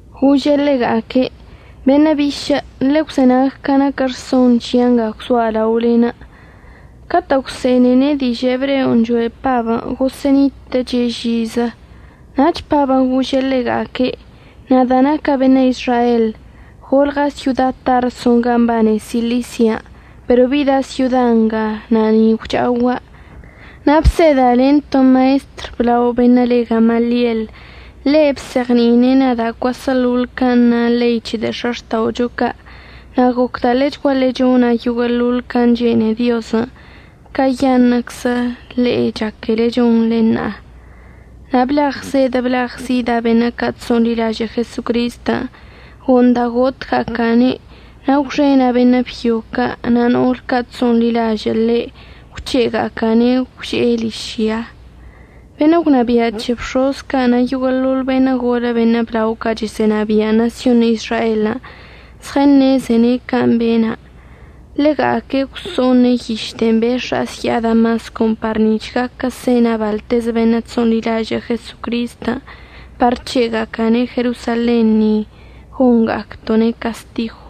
Gože' ḻega'aque': —Beṉə' bišə' ḻegwzenag ca naquə rson c̱hia' nga gwzoa' laolen'. Catə' gwse'ene'ene' dižə' ebreon' choe' Pabən', gosə'ənitə'əche' žizə. Nach Pabən' gože' ḻega'aque': —Nada' naca' beṉə' Izrael. Golɉa' syoda Tarso gan' mbane Silisian' pero bida' syoda nga na' ni gwcha'ogua'. Na' bseda' len to maestr əblaon' be'enə' le Gamaliel. Ḻe' bzeɉni'ine' nada' cuaseḻoḻ can' na ḻei c̱he de'e x̱axta'ocho ca'. Na' gocda' ḻechguaḻe chona' yoguə'əḻoḻ can' chene'e Diozən' cayaṉə'əczən' le'e chaquele chonḻe ṉa'a. Na' blagzeɉə blagzida' beṉə' ca' chso'onḻilažə' Jesocristən'. Go'onda' gotga'aca'ane' na' gwxena' beṉə' byo ca' na' no'ol ca' chso'onḻilažə' ḻe' gwc̱he'ega'aca'ane' gwže'e ližyan'. Beṉə' gwnabia' c̱he bx̱oz ca' na' yoguə'əḻoḻ beṉə' golə beṉə' blao ca' chəsə'ənabia' ṉasyon Izraelən' zɉəṉezene' can' bena'. Ḻega'aque' gwso'one' yiš de'e bex̱a'a əzya'a Damascon' par nic̱h gaquə sena' baḻtezə beṉə' chso'onḻilažə' Jesocristən' par c̱he'ega'aca'ane' Jerosalen ni gonga'acto'one' castigw.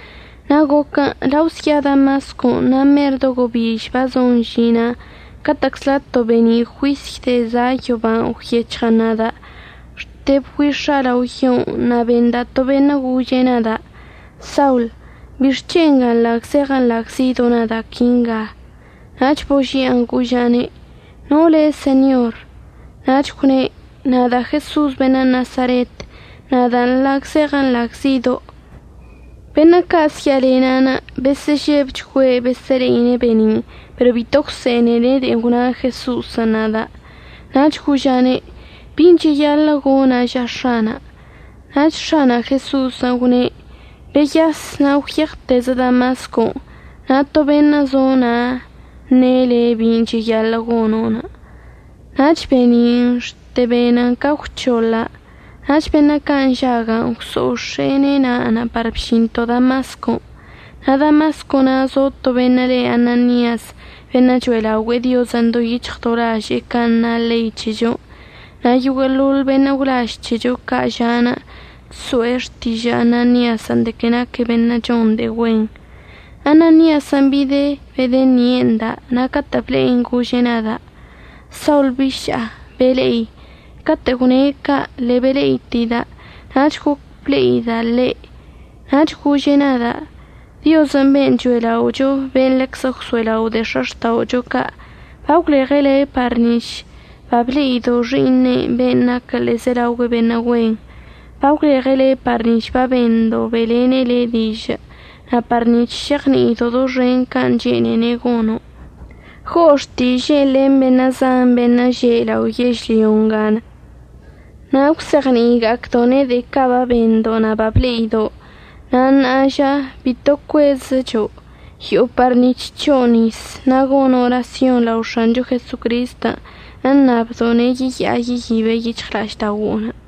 Na' goquən' lao əzya'a Damascon' na' mer do gobiž bazon əžina'anə' catə'əczla to be'eni' juisy de'en za' yoban' gwyec̱hɉən nada'. Xte bgüix̱a' lao yon' na' benda' to beṉə' gože' nada': “Saul, ¿bixc̱hen' nga nḻagzeɉə nḻagzido' nada' quinga?” Nach božia'an goža'ane': “¿No le' Señor?” Nach gwne': “Nada' Jeso'os beṉə' Nasaret. Nadan' nḻagzeɉə nḻagzido'.” Beṉə' ca' əzya'alena'anə' besə'əžebchgüe' besə'əle'ine' be'eni'inə' pero bito gwse'enene' de'en gwna Jeso'osən' nada'. Nach goža'ane': “¿Bin' cheyaḻə' gona' ža X̱ana'?” Nach X̱ana' Jeso'osən' gwne': “Beyas na' gwyeɉtezə Damascon', na' to beṉə' zo na' əṉe' le' bin' cheyaḻə' gono'.” Nach be'eni'inə' xte benən ca gwc̱hoḻa', nach beṉə' ca' nžaga'anə' gwso'ox̱e'ene' na'anə' par bžinto' Damascon'. Na' Damasco na' zo to beṉə' le Ananias beṉə' cho'elaogüe'e Diozən' do yic̱hɉ do laže'e can' na ḻei c̱hechon', na' yoguə'əḻoḻ beṉə' gwlaž c̱hecho ca' ža'anə' chso'e xtižə' Ananiasən' de que naque' beṉə' chon de'e güen. Ananiasən' bide' bedəṉie' nda' na' catə' ble'enə' gože' nada': “Saul biša'a, bele'i.” Catə' gwne' ca' ḻe'e bele'iteida', nach goc ble'ida' ḻe'. Nach gože' nada': “Diozən' ben' cho'ela'ocho, ben' ḻeczə gwso'elao' de'e x̱axta'ocho ca', bagwleɉe' le' par nic̱h bable'ido' Xi'iṉe'enə' ben' naquə ḻe'ezelaogüe beṉə' güen. Bagwleɉe' le' par nic̱h babendo' be'elene' le' dižə', na' par nic̱h šeɉni'ido' doxen can' chene'ene' gono'. Go'o xtiže'enə' len beṉə' zan beṉə' že' lao yežlyo nga na' əgwzeɉni'iga'acdo'one' de'e ca' babendo' na' bable'ido'. Na' ṉa'a ža, bito cuezəcho'. Yo'o par nic̱h c̱ho'o nis. Na' gono' orasyon lao X̱ancho Jesocristən' əṉabdo'one' yeya'a yeyibe' yic̱hɉla'ažda'ogo'onə'.”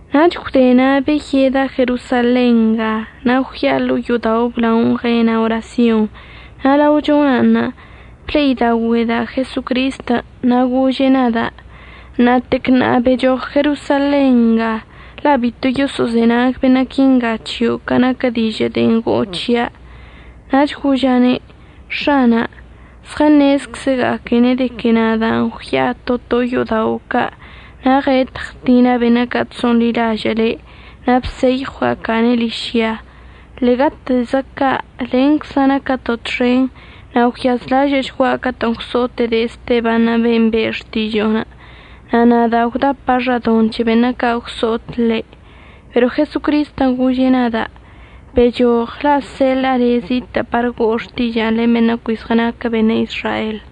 Nach gwde na' beyeda' Jerosalen nga na' gwya'a ḻo'o yo'odao' əblaonə' ɉena' orasyon na' lao chona'anṉə' ble'idaogüe'eda' Jesocristən'. Na' gože' nada': “Ṉa'atec ṉa'a bechoɉ Jerosalen nga la' bito yoso'ozenag beṉə' quinga c̱hio' ca naquə dižə' de'en go'o c̱hia'.” Nach goža'ane': “X̱ana', zɉəṉezczəga'aquene' de que nada'anə' gwya'a to to yo'odao' ca' na' ɉetə ɉtina' beṉə' ca' chso'onḻilažə' le' na' bseyɉwga'aca'ane' ližya. Ḻe'egatezə ca' lencza' naquəto' txen na' gwyazlažə'əchgua' catə'ən gwso'ote' de'e Esteban' ben' be'e xtižo'onə', na' nada' gwdapa' xadoṉ c̱he beṉə' ca' gwso'ot ḻe'.” Pero Jesocristən' gože' nada': “Bchoɉ la' əseḻa'a le' zitə' par go'o xtiža'anə' len beṉə' cui zɉənaquə beṉə' Izrael.”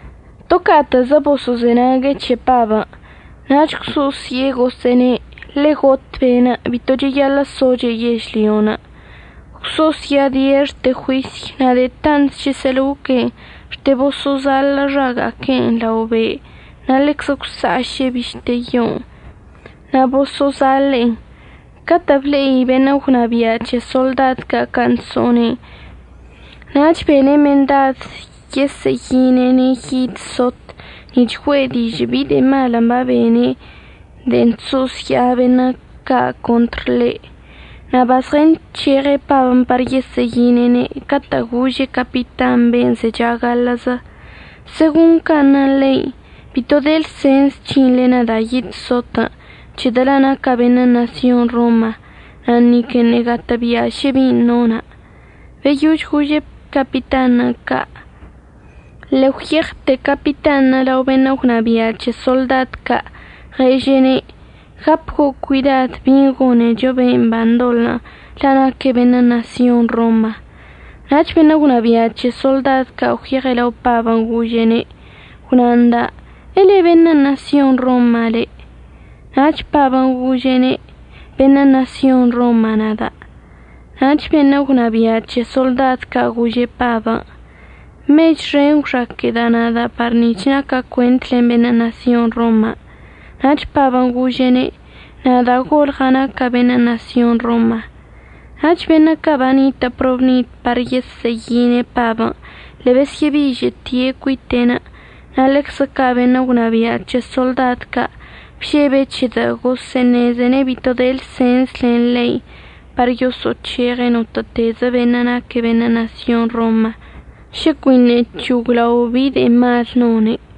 To ca'atə'əzə boso'ozenague' c̱he Pabən', nach gwso'osye'e gosə'əne': —Ḻe'e got be'enə'. Bito cheyaḻə' soche' yežlyon'. Gwso'osya'adie' xte juisy. Na' de'e tant chəsə'əloque' xte boso'ozaḻə' xaga'aque'enə' lao be' na' ḻeczə gwsa'aše'e bište yon' na' boso'ozaḻe'en. Catə' ble'i beṉə' gwnabia' c̱he soḻdad ca' can' chso'one'enə' nach bene' mendad yesə'əyine'ene' yid sot nic̱h güe'e dižə' bi de'e malən' babene' de'en chso'osya'a beṉə' ca' contr ḻe'. Na' bazɉənc̱heɉe' Pabən' par yesə'əyine'ene' catə' gože' capitanṉə' ben' zecha gaḻə'əzə: —Segon can' na ḻein', bito de lsens c̱hinḻe nada' yid sotən' c̱hedə' la' naca' beṉə' ṉasyon Roma na' niqueṉə' gatə'əbia' šə bin' nona'. Beyož gože' capitanṉə' ca' ḻe'e gwyeɉte' capitanṉə' lao beṉə' gwnabia' c̱he soḻdad ca', ɉeže'ene': —Gapgo' cuidad bin' gonecho ben' bandoḻə' la' naque' beṉə' ṉasyon Roma. Nach beṉə' gwnabia' c̱he soḻdad ca' gwyeɉe' lao Pabən', gože'ene': —Gwna nda' ¿əḻe beṉə' ṉasyon Roma le'? Nach Pabən' gože'ene': —Beṉə' ṉasyon Roma nada'. Nach beṉə' gwnabia' c̱he soḻdad ca' gože' Pabən': —Mech xen gwxaquə'əda' nada' par nic̱h naca' cuent len beṉə' ṉasyon Roman'. Nach Pabən' gože'ene': —Nada' golɉa' naca' beṉə' ṉasyon Roman'. Nach beṉə' ca' banitə' probnid par yesə'əyine' Pabən' ḻe'e besyə'əbižə'əte' cuite'enə', na' ḻeczə ca' beṉə' gwnabia' c̱he soḻdad ca' bžebe' c̱hedə' gosə'əṉezene' bito de lsens len ḻein' par yoso'oc̱heɉe' notə'ətezə beṉə' naquə beṉə' ṉasyon Roman' šə cuiṉə' c̱hoglaon bi de'e mal none'.